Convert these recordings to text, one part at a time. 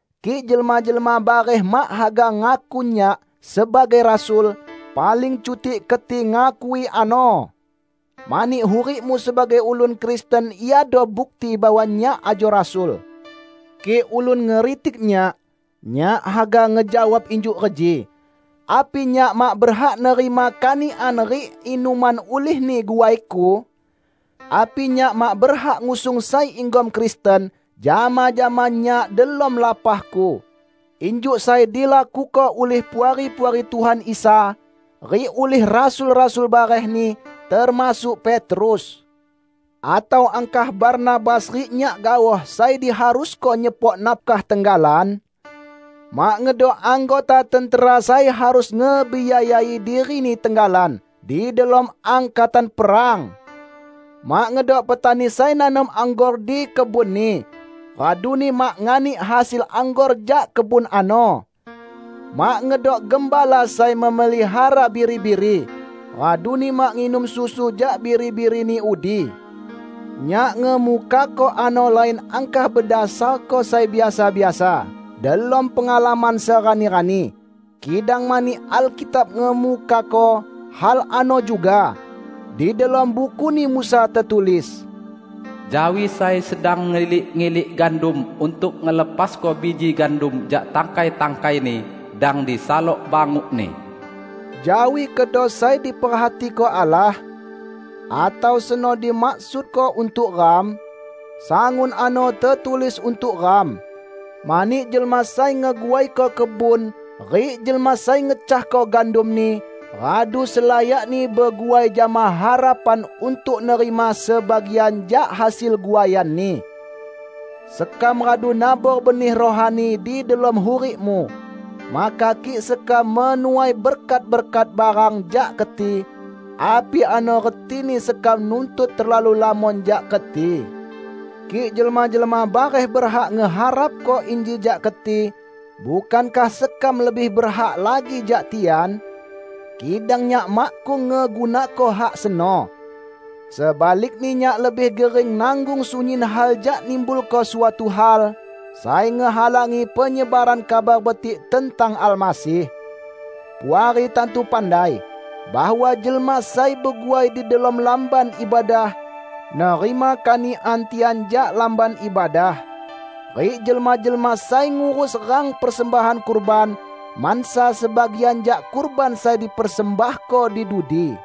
Kik jelma-jelma bareh mak haga ngaku nyak sebagai rasul, paling cutik keti ngakui ano! Mani hurikmu sebagai ulun Kristen iado bukti bahwa nyak ajo rasul. Kik ulun ngeritik nyak, nyak haga ngejawab injuk reji: Api nyak mak berhak nerima kanikan rik inuman ulihni guaiku? Api nyak mak berhak ngusung sai inggom Kristen jama-jama nyak delom lapahku, injuk sai dilakuko ulih puari-puari Tuhan Isa rik ulih rasul-rasul barehni, termasuk Petrus? Atau angkah Barnabas rik nyak gaoh sai diharusko nyepok nafkah tenggalan? Mak ngedok anggota tentera sai harus ngebiayai dirini tenggalan di delom angkatan perang! Mak ngedok petani sai nanom anggor di kebunni raduni mak nganik hasil anggor jak kebun ano! Mak ngedok gembala sai memelihara biri-biri, raduni mak nginum susu jak biri-birini udi! Nyak ngemukako ano lain angkah bedasarko sai biasa-biasa delom pengalaman serani-rani, kidang mani Alkitab ngemukako hal ano juga. Di delom Bukuni Musa tetulis, "Jawi sai sedang ngilik-ngilik gandum untuk ngelepasko biji gandum jak tangkai-tangkaini, dang disalok bangukni." Jawi kedo sai diperhatiko Allah? Atau seno dimaksudko untuk ram? Sangun ano tetulis untuk ram. Mani jelma sai ngeguaiko kebun rik jelma sai ngecahko gandumni radu selayakni beguai jama harapan untuk nerima sebagian jak hasil guaianni. Sekam radu nabor benih rohani di delom hurikmu. Maka kik sekam menuai berkat-berkat barang jak keti, api ano retini sekam nuntut terlalu lamon jak keti? Kik jelma-jelma bareh berhak ngeharapko inji jak keti, bukankah sekam lebih berhak lagi jak tian? Kidang nyak makkung ngegunako hak seno. Sebalikni nyak lebih gering nanggung sunyin hal jak nimbulko suatu hal sai ngehalangi penyebaran Kabar Betik tentang Almasih. Puari tantu pandai bahwa jelma sai beguai di delom Lamban Ibadah nerima kanikan tian jak Lamban Ibadah. Rik jelma-jelma sai ngurus rang persembahan kurban, mansa sebagian jak kurban sai dipersembahko di dudi.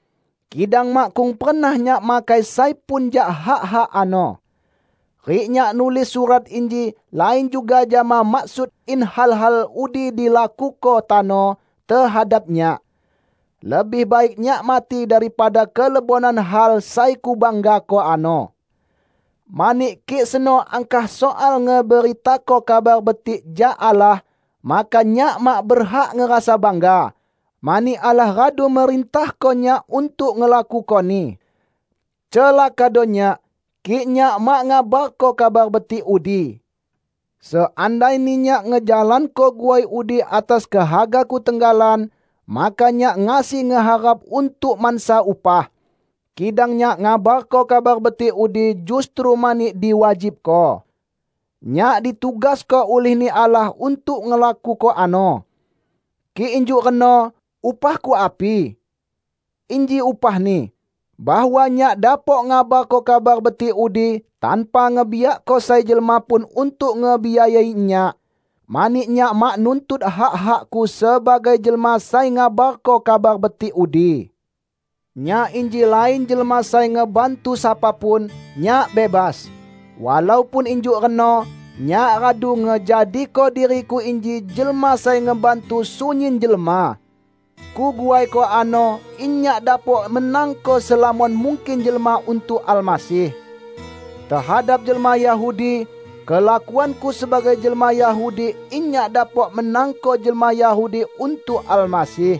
Kidang makkung pernah nyak makai sai pun jak hak-hak ano. Rik nyak nulis surat inji lain juga jama maksud in hal-hal udi dilakuko tano tehadap nyak. Lebih baik nyak mati daripada kelebonan hal sai kubanggako ano. Mani, kik seno angkah soal ngeberitako Kabar Betik jak Allah, maka nyak mak berhak ngerasa bangga, mani Allah radu merintahko nyak untuk ngelakukoni. Celakado nyak, kik nyak mak ngabarko Kabar Betik udi! Seandaini nyak ngejalanko guai udi atas kehagaku tenggalan, maka nyak ngasi ngeharap untuk mansa upah. Kidang nyak ngabarko Kabar Betik udi justru mani diwajibko. Nyak ditugasko ulih-Ni Allah untuk ngelakuko ano. Kik injuk reno, upahku api? Inji upahni: bahwa nyak dapok ngabarko Kabar Betik udi tanpa ngebiakko sai jelma pun untuk ngebiayai nyak, mani nyak mak nuntut hak-hakku sebagai jelma sai ngabarko Kabar Betik udi. Nyak inji lain jelma sai ngebantu sapa pun; nyak bebas. Walaupun injuk reno, nyak radu ngejadiko diriku inji jelma sai ngebantu sunyin jelma. Kuguaiko ano in nyak dapok menangko selamon mungkin jelma untuk Almasih. Tehadap jelma Yahudi, kelakuanku sebagai jelma Yahudi in nyak dapok menangko jelma Yahudi untuk Almasih.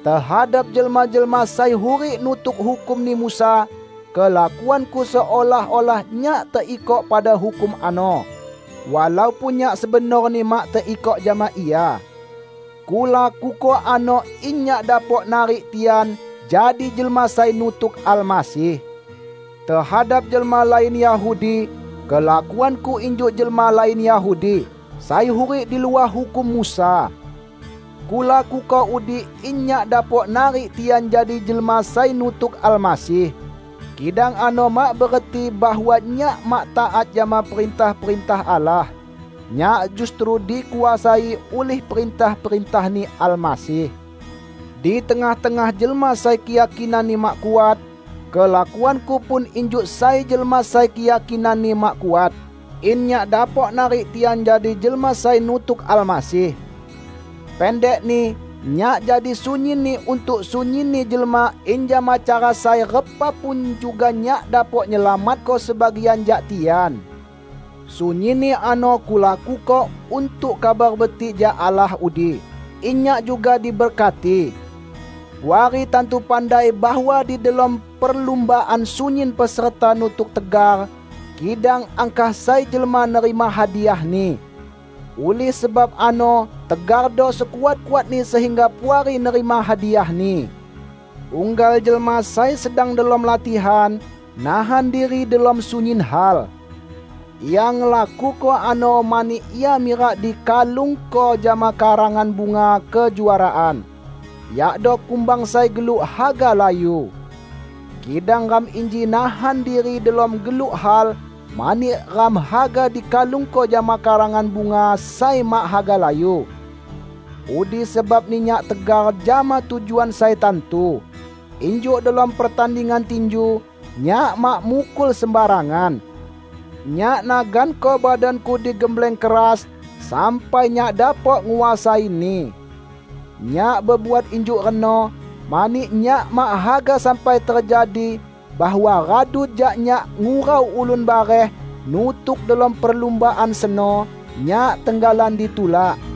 Tehadap jelma-jelma sai hurik nutuk hukumni Musa, kelakuanku seolah-olah nyak teikok pada hukum ano, walaupun nyak sebenorni mak teikok jama ia. Kulakuko ano in nyak dapok narik tian jadi jelma sai nutuk Almasih. Tehadap jelma lain Yahudi, kelakuanku injuk jelma lain Yahudi, sai hurik di luah hukum Musa. Kulakuko udi in nyak dapok narik tian jadi jelma sai nutuk Almasih. Kidang ano mak bereti bahwa nyak mak taat jama perintah-perintah Allah; nyak justru dikuasai ulih perintah-perintah-Ni Almasih. Di tengah-tengah jelma sai keyakinanni mak kuat, kelakuanku pun injuk sai jelma sai keyakinanni mak kuat, in nyak dapok narik tian jadi jelma sai nutuk Almasih. Pendekni, nyak jadi sunyinni untuk sunyinni jelma in jama cara sai repa pun juga nyak dapok nyelamatko sebagian jak tian. Sunyinni ano kulakuko untuk Kabar Betik jak Allah udi, in nyak juga diberkati. Puari tantu pandai bahwa di delom perlumbaan sunyin peserta nutuk tegar, kidang angkah sai jelma nerima hadiahni. Ulih sebab ano tegardo sekuat-kuatni sehingga Puari nerima hadiahni. Unggal jelma sai sedang delom latihan, nahan diri delom sunyin hal. Ia ngelakuko ano mani ia mirak dikalungko jama karangan bunga kejuaraan, yakdo kumbang sai geluk haga layu. Kidang ram inji nahan diri delom geluk hal mani ram haga dikalungko jama karangan bunga sai mak haga layu. Udi sebabni nyak tegar jama tujuan sai tantu. Injuk delom pertandingan tinju, nyak mak mukul sembarangan. Nyak naganko badanku digembleng keras sampai nyak dapok nguasaini. Nyak bebuat injuk reno, mani nyak mak haga sampai tejadi bahwa radu jak nyak ngurau ulun bareh nutuk delom perlumbaan seno, nyak tenggalan ditulak.